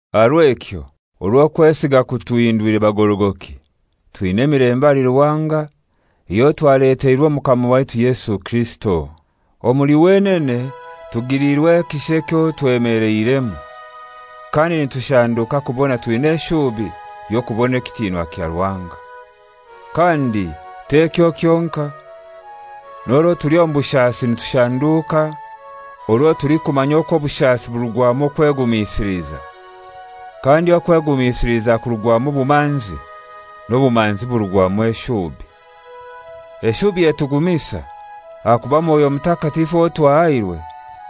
Aha rw'ekyo, orwo okwesiga kutuhindwire bagorogoki, twina emilembe ahali Ruhanga eyo twaleteirwe Omukama waitu Yesu Kirisito. Omuli wenene tugiliirwe ekisha ekyo twemeleiremu, kandi nitushanduuka kubona twina eshubi y'okubona ekitinwa kya Ruhanga. Kandi t'ekyo kyonkai: N'orwo tuli omu bushasi nitushanduuka, orwo tulikumanya okwo obushasi burugwamu okwegumisiliza, kandi okwegumisiliza kurugwamu obumanzi, n'obumanzi burugwamu eshubi. Eshubi etugumisa, ahakuba Mwoyo Mutakatifu owo twahairwe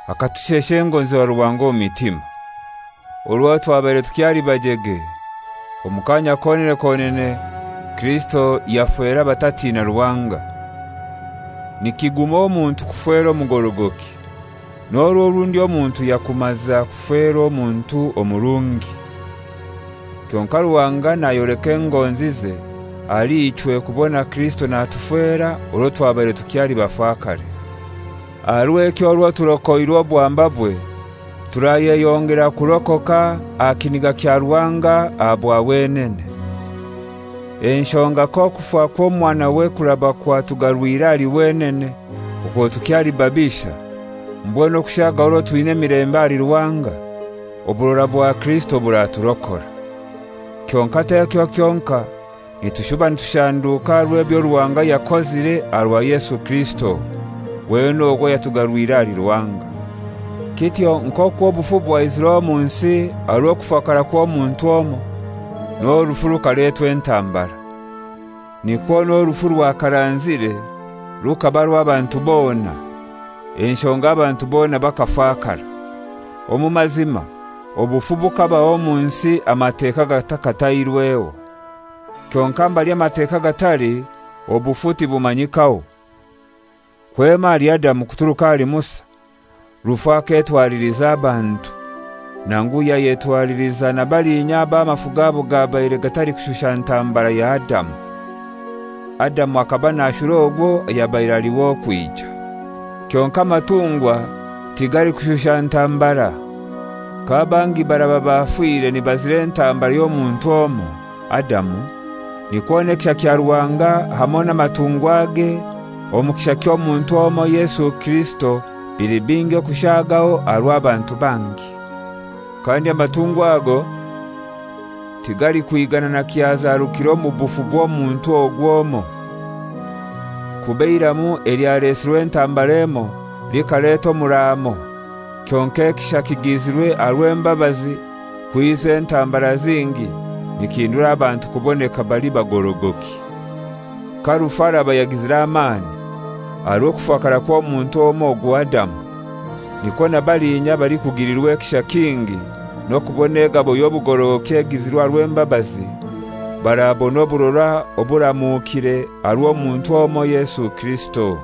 akatushesha engonzi za Ruhanga omu mitima. Orwo twabaire tukyali bajege, omu kaanya konene konene Kirisito yafera abatatina Ruhanga. Nikiguma omuntu kufera omugorogoki, n'orwo orundi omuntu yakumaza kufera omuntu omurungi. Kyonkai Ruhanga nayoleka engonzize ahali ichwe kubona Kirisito natufera orwo twabaire tukyali bafakare. Aha rw'ekyo orwo turokoirwe obwambabwe, turayeyongera kurokoka aha kiniga kya Ruhanga aha bwa wenene. Enshonga k'okufa kw'Omwanawe kuraba kwatugarwire ahali wenene okwo tukyali babisha, mbwenu okushaagaho orwo twina emilembe ahali Ruhanga, oburora bwa Kirisito buraturokora. Kyonkai t'ekyo kyonkai, nitushuba nitushanduuka aha rw'ebyo Ruhanga yakozire aha rwa Yesu Kirisito, wenene ogu ayatugarwire ahali Ruhanga. Kityo nk'okwo obufu bwaizire omu nsi aha rw'okufakara kw'omuntu omoi, n'orufu rukaletwa entambara, nikwo n'orufu rwakaranzire rukaba rw'abantu bona enshonga abantu bona bakafakara. Omu mazima obufu bukabaho omu nsi Amateka gatakatairweho, kyonkai mbali Amateka gatali obufu tibumanyikaho. Kwema ahali Adamu kuturuka ahali Musa rufu aketwaliliza abantu, nangu yayetwaliliza na balinya abo amafu gabo gabaire gatalikushusha ntambara ya Adamu. Adamu akaba nashura ogwo ayabaire ali w'okwija. Kyonkai amatungwa tigalikushusha ntambara. K'abangi baraba bafire nibazira entambara y'omuntu omoi, Adamu, nikwo n'ekisha kya Ruhanga hamoi n'amatungwage omu kisha ky'omuntu omoi Yesu Kirisito bili bingi okushaagaho aha rw'abantu bangi. Kandi amatungwa ago tigalikwigana na kyazarukire omu bufu bw'omuntu ogwo omoi. Kuba eiramu elyalesirwe entambara emoi likaleta omuramo, kyonkai ekisha ekigizirwe aha rw'embabazi kwiza entambara zingi nikihindura abantu kuboneka bali bagorogoki. Ka rufu araba yagizire amani aha rw'okufakara kw'omuntu omoi ogwo Adamu, nikwo na balinya abalikugilirwa ekisha kingi n'okubona egabo y'obugorogoki egizirwe aha rw'embabazi barabona oburora oburamukire aha rw'omuntu omoi Yesu Kirisito.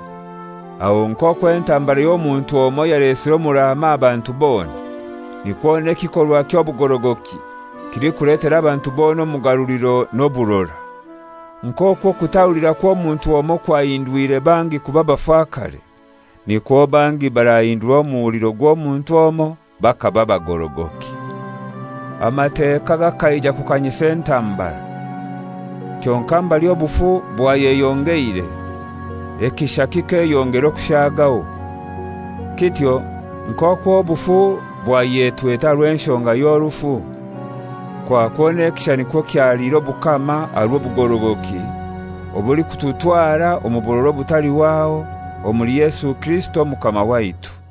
Aho nk'okwo entambara y'omuntu omoi yalesire omuraamo aha bantu bona, nikwo n'ekikorwa ky'obugorogoki kilikuletera abantu bona omugaruliro n'oburora. Nk'okwo okutahulira kw'omuntu omoi kwahindwire bangi kuba bafakare nikwo bangi barakorwa omuhuliro gw'omuntu omoi bakaba bagorogoki? Amateka gakaija kukanyisa entambara; kyonkai mbali obufu bwayeyongeire, ekisha kikeyongera okushaagaho, Kityo nk'okwo bufu bwayetwete aha rw'enshonga ya rufu, kwakwo n'ekisha nikwo kyaliire obukama aha rw'obugorogoki obulikututwara omu burora obutalihwaho omuli Yesu Kirisito Omukama waitu.